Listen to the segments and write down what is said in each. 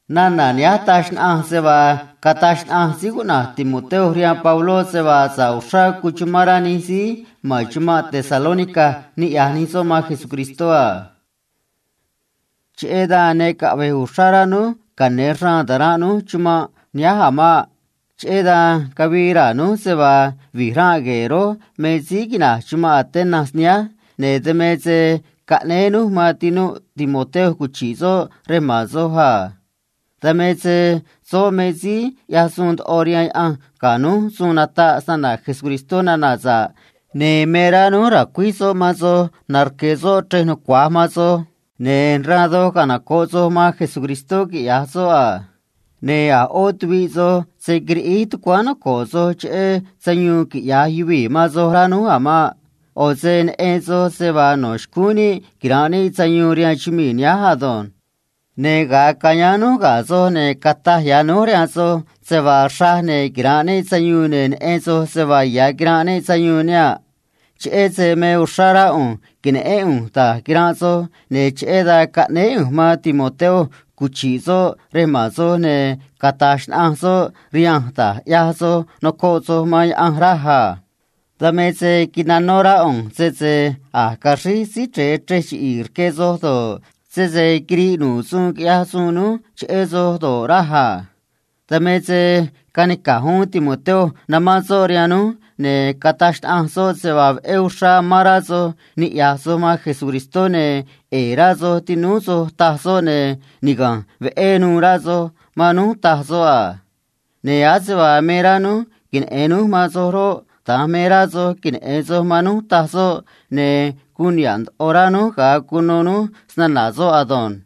Nana̱ nihánj taj xnaꞌanj se vaa cataj xnaꞌanj síí cuꞌna̱j Timoteo rihaan Pabló se vaa sa̱ꞌ uxrá cuchumán rá nij síí ma̱n chumanꞌ Tesalónica niꞌya̱j nij soꞌ man Jesucristó a Cheꞌé dan ne caꞌve̱j uxrá rá núj cane̱ ra̱a̱n taranꞌ núj chumanꞌ nihánj a̱ maꞌ. Cheꞌé dan cavii raa̱ núj se vaa vi̱j ranꞌ gue̱e̱ rój me síí quina̱j chumanꞌ Atenas nihánj, ne̱ dan me se caꞌnéé núj man tinúꞌ Timoteo cuchi̱ꞌ soꞌ rej ma̱n soj a. Dan me se soꞌ me síí ꞌyaj suun ndoꞌo rihaan Diose̱ ga̱ núj suun nataꞌ se‑na̱na̱ Jesucristó nana̱ sa̱ꞌ, ne̱ me rá núj ra̱cuíj soꞌ man soj, narque̱ soꞌ chrej nucua̱j man soj, ne̱ raan doj canoco̱ꞌ soj man Jesucristó, quiꞌya̱j soꞌ, ne̱ a̱ ꞌó tuviꞌ soj se̱ quiriꞌíj tucuáán noco̱ꞌ soj cheꞌé sayuun quiꞌya̱j yuvii̱ man soj, rá núj a̱ maꞌ. ꞌO̱ se neꞌen soj se vaa no̱ xcúún níꞌ quira̱nꞌ níꞌ sayuun rihaan chumii̱ nihánj, ne̱ ga̱a cayáán núj ga̱ soj, ne̱ cataj ya̱ núj rihaan soj se vaa xraj, ne̱ quira̱nꞌ níꞌ sayuun, ne̱ neꞌen soj se vaa ya̱ quiranꞌ níꞌ sayuun nihaꞌ. Cheꞌé se me uxrá rá ꞌu̱nj que̱neꞌén ꞌu̱nj da̱j quiranꞌ soj, ne̱ cheꞌé dan caꞌnéé ꞌu̱nj man Timoteo cuchi̱ꞌ soꞌ rej ma̱n soj, ne̱ cata̱j xnaꞌanj soꞌ rihanj da̱j ꞌyaj soj noco̱ꞌ soj man Diose̱, raj a. Dan me se quinano̱ rá ꞌu̱nj sese a̱j caxríj síí chre̱e chrej chiꞌi̱i̱ rque soj do̱ꞌ, sese quiriꞌ nu̱ꞌ suun quiꞌyaj suun núj cheꞌé soj do̱ꞌ, raj a. Dan me se canica̱j uún Timoteo namán soꞌ rihaan núj, ne̱ cataj xnaꞌanj soꞌ se vaa veꞌé uxrá amán rá soj niꞌya̱j soj man Jesucristó, ne̱ ꞌe̱e̱ rá soj tinúú soj, taj soꞌ, ne̱ niga̱nj veꞌé nuû rá soj man núj, taj soꞌ, ne̱ ase vaa me rá núj queneꞌe̱n núj man soj roꞌ, da̱nj vaa rá soj me rá soj queneꞌe̱n soj man núj, taj soꞌ, ne̱ guun niha̱ꞌ ndoꞌo rá núj ga̱a cuno núj se‑na̱na̱ soꞌ ado̱nj.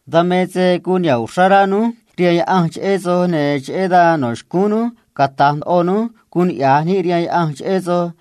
Dan me se guun niha̱ꞌ uxrá rá núj rihaan Diose̱ cheꞌé soj, ne̱ cheꞌé dan no̱ xcúún núj nago̱ꞌ ndoꞌo núj graciá rihaan Diose̱ cheꞌé soj,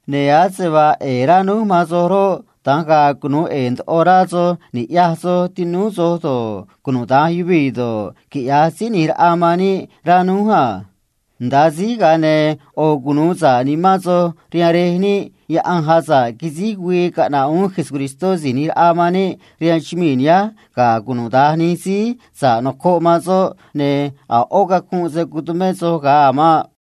ne̱ ase vaa ꞌe̱e̱ rá núj man soj roꞌ, da̱nj ga̱a̱ cunu̱u ꞌe̱e̱ ndoꞌo rá soj ni̱ꞌyaj soj tinúú soj do̱ꞌ, cunuda̱nj yuvii̱ do̱ꞌ, quiꞌya̱j síí ꞌni̱j raꞌa man níꞌ, rá núj a. Nda̱a síj, ga̱a ne̱ yoꞌo̱ cunu̱u sa̱ꞌ nimán soj rihaan Rej níꞌ Diose̱ ga̱a güii caꞌna̱ꞌ uún Jesucristó si̱j ꞌni̱j raꞌa man níꞌ rihaan chumii̱ nihánj ga̱a cunuda̱nj nij se‑mo̱zó soꞌ síí gue̱e̱, ne̱ a̱ ꞌó cacunꞌ se̱ tumé soj vaa ga̱a̱ man ado̱nj.